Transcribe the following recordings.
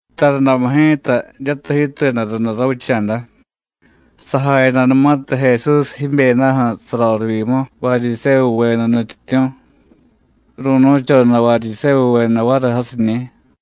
Tarundamu ji̱ta jiryatiy jiituyada runda ravicha̱da, sajayadanumatiy Jesús jibyedaju̱ sarorivyimu Varyisévuveda nutyityu̱, ru̱nu̱choda Varyisévuveda variy jasiñi̱.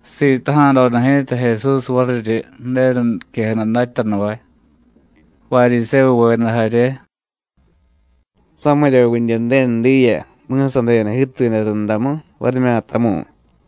Sitaja̱doda ji̱ta Jesús variryi Ju̱denu niquejada datyanuvay, Varyisévuveda jarye: “¿Samiryavidye Ju̱denu diya, mi̱sadeda jiituyada rundamu, varimyatamu̱y?”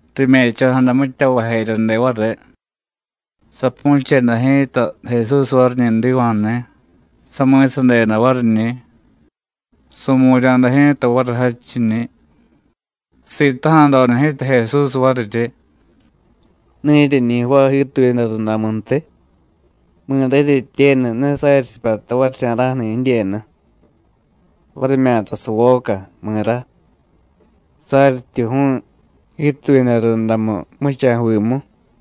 Rime̱cho̱jada mitya vajeryade variy. Sapu̱cheda ji̱ta Jesús variñi̱ jdiva̱jni̱, sami̱sadeda variñi̱, su̱mu̱rya̱da ji̱ta variy jadchiñi̱. Sitaja̱doda ji̱ta Jesús variryi: “¿Ne jiryeñi jvaay jiituyada rundamuntiy? ¿Mi̱ra jiryetyenu ne saryi sipyata varicha̱ra̱ju̱ni̱ jidyenu varimyata savoca, mi̱ra? saryityi ju̱u̱y jiituyada rundamu jmuchaju̱vimu.”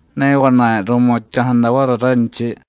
Ne vana̱y ru̱mutya̱jada variy ranchiy.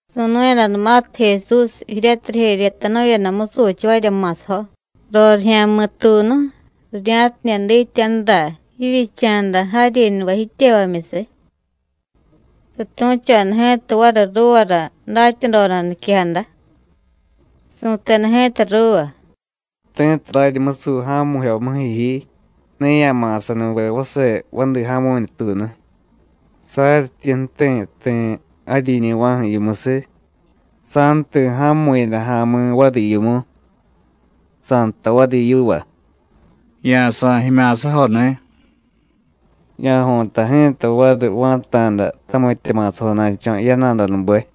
Su̱nu̱yadanumatiy Jesús jiryatiy rijeryetanu̱yada musuchavarya ma̱sajo rorijya̱mi̱tuunu rirya̱tidye dityanura jivyicha̱da jaryiñuvay jityevamyusiy, satu̱choda ji̱ta variy ruuvara datyadoda niquejada. Su̱teda ji̱ta ruuva: “Ti̱tiy raryi musuy ja̱mu̱jyomuju̱ ji, ne ya̱ma̱sanuve vase vadi ja̱mu̱ñutuunu, saryityi ju̱ti̱ ti̱ jaryiñu̱va̱ju̱ yimusiy, sa̱jti̱ ja̱mu̱yada ja̱mi̱ variy yimu, sa̱jtay variy yiva: Ya̱sa̱y jimya̱sajoni̱. Ya̱jo̱ta ji̱ta variy va̱ta̱da tamitya ma̱sajona̱cho̱ yana̱danube.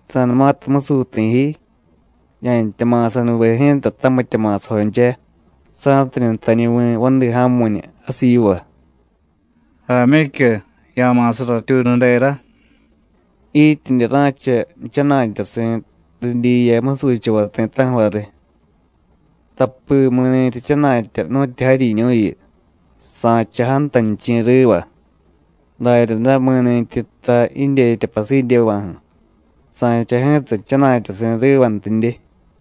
Sa̱numatiy musuy ti̱ ji, ya̱ntya ma̱sanuve ji̱ta tamitya ma̱sajoncha, sa̱tidye jtañuvi̱ vadi ja̱mu̱ñu jasiy yiva: Jaamyicyu, ya̱ma̱sa ratyuunudera, jityidye ra̱cha jchana̱tyasi̱ ridyiya musuchavay ti̱ta̱ju̱ variy. Tapi mi̱ni̱tyi jchana̱tya nu̱tyu jaryiñu̱yu, sa̱cha jantanichi̱ riva, daryaday mi̱ni̱tyi jtay jidyetya pasidyeva̱ju̱, sa̱cha ji̱ta jchana̱tyasi̱ rivantidye.”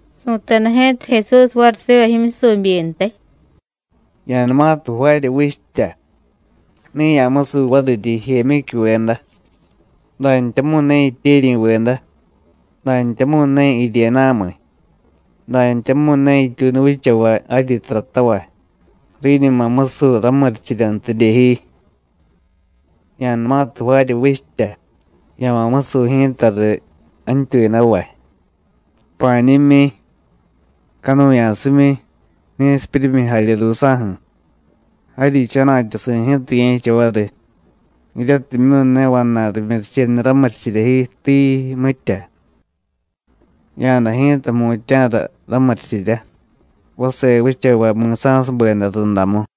Su̱teda ji̱ta Jesús variy siva jimyusubyintiy: “Ya̱numatiy jvaarya vichtya, ne ya̱musuy variryi jijemyicyuveda, dantyamu̱y ne jityeryi̱veda, dantyamu̱y ne jiryena̱miy, dantyamu̱y ne jityuunu vichavay jaryi taratavay, riñuma musuy ramurichiryantidye ji. Ya̱numatiy jvaarya vichtya, ya̱ma̱ musuy ji̱ta riy jantyuyadavay, pa̱ñimyi, canuya̱simyi, ni̱sipyuryimyi jarye ruusa̱ju̱. Jaryi jchana̱tyasi̱ ji̱ta ye̱cha variy, jiryatimyu̱ ne vana̱y rimyurichenu ramurichirya ji, tii, mitya. Ya̱day ji̱ta jmutya̱ra ramurichirya, vase vichavay mi̱sa̱subeda rundamu.”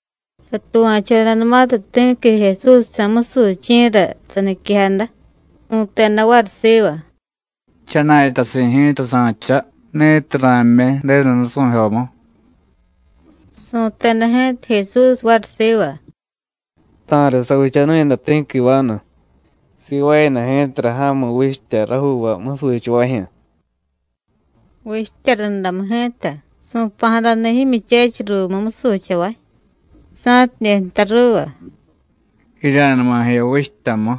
Satuva̱chodanumatiy ti̱qui Jesúsjsa̱ musuchi̱ra saniquejada, su̱teda variy siva: “Jchana̱tyasi̱ ji̱ta sa̱cha, ni̱tiy ra̱jmyi Ju̱denu nusu̱jyomu.” Su̱teda ji̱ta Jesús variy siva: “Ta̱riy savichanu̱yada ti̱qui vanu. Sivaayada ji̱tara ja̱mu vichtya rajuuvay musuchavajyu̱. Vichtya rundamu ji̱ta su̱pa̱jadani̱ jimyuchechiy ruumu musuchavay, sa̱tidye jtay ruuva: Jirya̱numa jiya vichtyamu,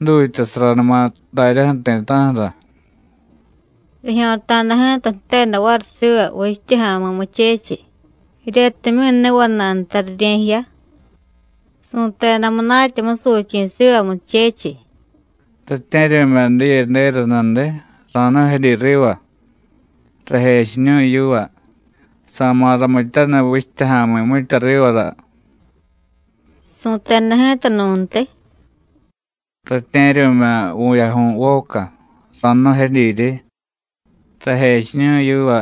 jdutyasaranuma daryaju̱ ti̱ta̱ju̱ra. Rijyo̱ta̱da ji̱ta jteda variy siva vichtya ja̱mi̱ muchechiy, jiryatimyu̱ ne vana̱y nta rirye̱jiya. Su̱teda munatya musuchi̱ siva muchechiy: Ratye̱ryu̱mya̱ diyedera nudiy, ra̱jnu̱jedyi riva. Rajechiñu̱y yiva sa̱ma̱ ramityaniy vichtya ja̱mi̱ mitya rivara. Su̱teda ji̱ta nu̱ntiy: Ratye̱ryu̱mya̱ vu̱yaju̱y voca, ra̱jnu̱jedyiryi. Rajechiñu̱y yiva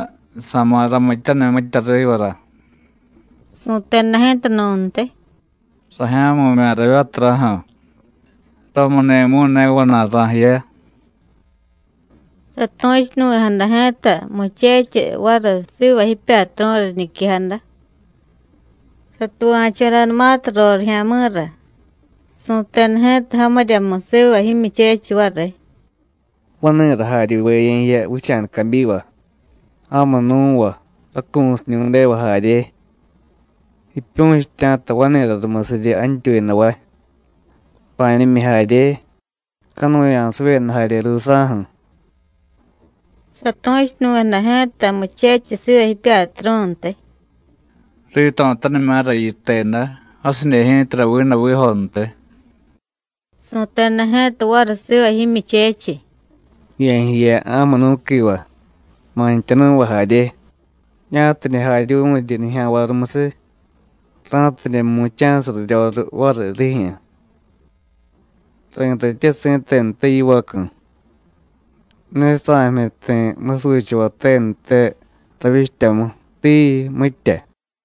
sa̱ma̱ ramityaniy mitya rivara. Su̱teda ji̱ta nu̱ntiy: Rajya̱mu̱mya̱ ravyaturaju̱, ramuni̱mu̱y ne vana̱y ra̱jiya. Satu̱chunuvi̱jada ji̱ta muchechiy variy siva jipyatru̱ra riñiquejada. Satuva̱chodanumatiy rorijya̱mi̱ra, su̱teda ji̱ta jamiryamu siva jimyuchechiy variy: Vani̱ra jaryuve ye̱jiya vicha̱da cabyiva, ja̱mu nú̱va, racu̱siñu̱deva jarye, jiipyu̱chitya̱ta vani̱ra rumusiryi jantyuyadavay, pa̱ñimyi jarye, canuya̱sivyeda jarye ruusa̱ju̱. Satu̱chunuvi̱jada ji̱ta muchechiy siva jipyatru̱ntiy: Rito̱tanimya̱ra yiteda, jasidye ji̱tara vidavijontiy. Su̱teda ji̱ta variy siva jimyuchechiy: Ye̱jiya ja̱munú̱quiva, mantyanú̱va jarye, ya̱tidye jaryuvu̱ryi nijya̱nvay rumusiy, ra̱tidye mu̱cha̱siy raryoriy variy rijyu̱. Ri̱tatye si̱tenute yivacu̱, ¡ne sa̱jmyi ti̱ musuchavay tenute ravyichtyamu, tii, mitya!”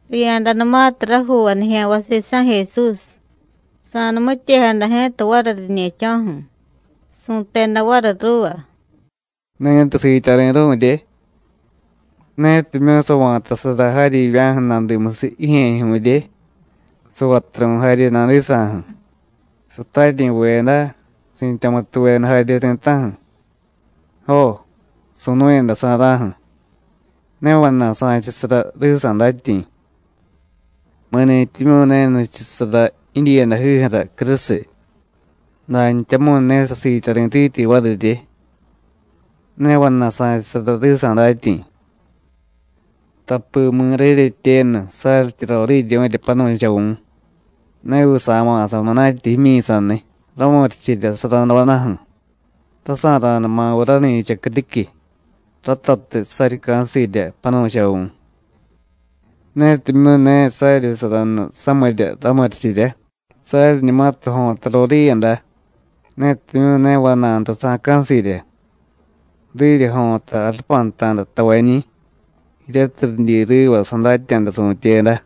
Riya̱danumatiy rajuuvay nijya̱nvay sisa̱ Jesús, sa̱numityejada ji̱ta variy riñe̱cho̱ju̱, su̱teda variy ruuva: “Ni̱tiy siityari̱ru̱rye, netimyu̱ sa̱va̱tasara jaryivya̱ju̱ nadimusiy jijye̱jyu̱rye, savaturu̱y jarye nadisa̱ju̱, sataryi̱veda, si̱tyamutuveda jarye ti̱ta̱ju̱, jo, su̱nu̱yadasa̱ra̱ju̱, ne vana̱y sa̱chasara risa̱ datyi̱. Mi̱ni̱tyimyu̱ ne nichusara jidyiiyadajiju̱ra crusiy, dantyamu̱y ne sasiityari̱tityi varirye, ne vana̱y sa̱chasara risa̱ datyi̱. Tapi mi̱ra jiryetyenu, saryityi roriiryu̱rya panu̱chavu̱, ¿ne viy sa̱ma̱sa munatya jimyi̱saniy, ramurichirya suradodaju̱, rasa̱ra̱numaviy rani̱cha criquiy, ratatiy saryi ca̱sirya panu̱chavu̱? Netimyu̱ ne saryi suranu samirya ramurichirya, saryiñumatiy jo̱ta roriiyada, netimyu̱ ne vana̱y nta sa̱ca̱sirya, riryi jo̱ta jarupanta̱da tavañi̱, jiryatiy ridyi riva sadatya̱da su̱tyeda.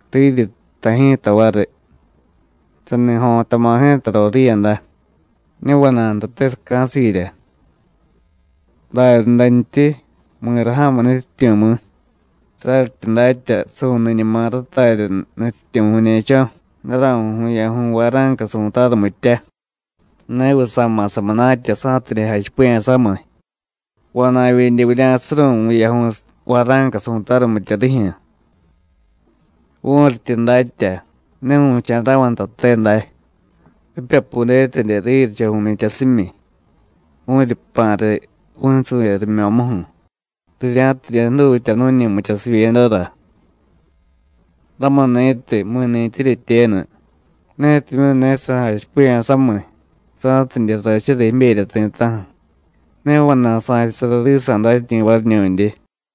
Riryi jtay ji̱ta variy: Sani jo̱tama̱ ji̱ta roriiyada, ne vana̱y ntate saca̱sirya. Daryadantyi, ¿mi̱ra ja̱mu nutyityu̱, mi̱? saryityi datya: Su̱niñuma ratarya nutyityu̱ vu̱ñe̱cho̱, daraju̱y vu̱yaju̱y vara̱nca su̱tarumitya, ne viy sa̱ma̱sa munatya, sa̱tidye jachipiya̱ samiy: ‘Vana̱vyidye vurya̱suru̱y vu̱yaju̱y vara̱nca su̱tarumitya rijyu̱.’ Vu̱ryityi datya: Ne vu̱cha̱ra̱vay ntate day, ripyapudetidye riryicha vu̱myityasimyi, vu̱ryi jpa̱ riy vu̱nsu̱vye rimyo̱muju̱, rirya̱tidye jdutya nu̱ñi mityasivyedara. Ramuni̱tiy, mi̱ni̱tyi jiryetyenu, netimyu̱ ne sajachipiya̱ samiy sa̱tidye rrachura jiberya ti̱ta̱ju̱, ne vana̱y sa̱chasara risa̱ datyi̱ variñu̱ndye.”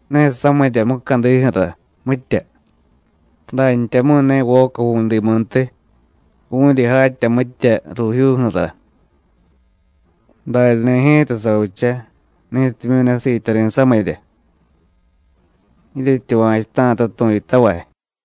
Ne samirya mucadiju̱ra, mitya, dantyamu̱y ne voca ju̱vu̱dimuntiy. Vu̱ryi jatya mitya ruujyuuju̱ra. Daryani̱ ji̱ta savicha ni̱timyu̱ ne siityari̱ samirya. Jiryetyuva̱chuta̱ta tu̱yutavay.”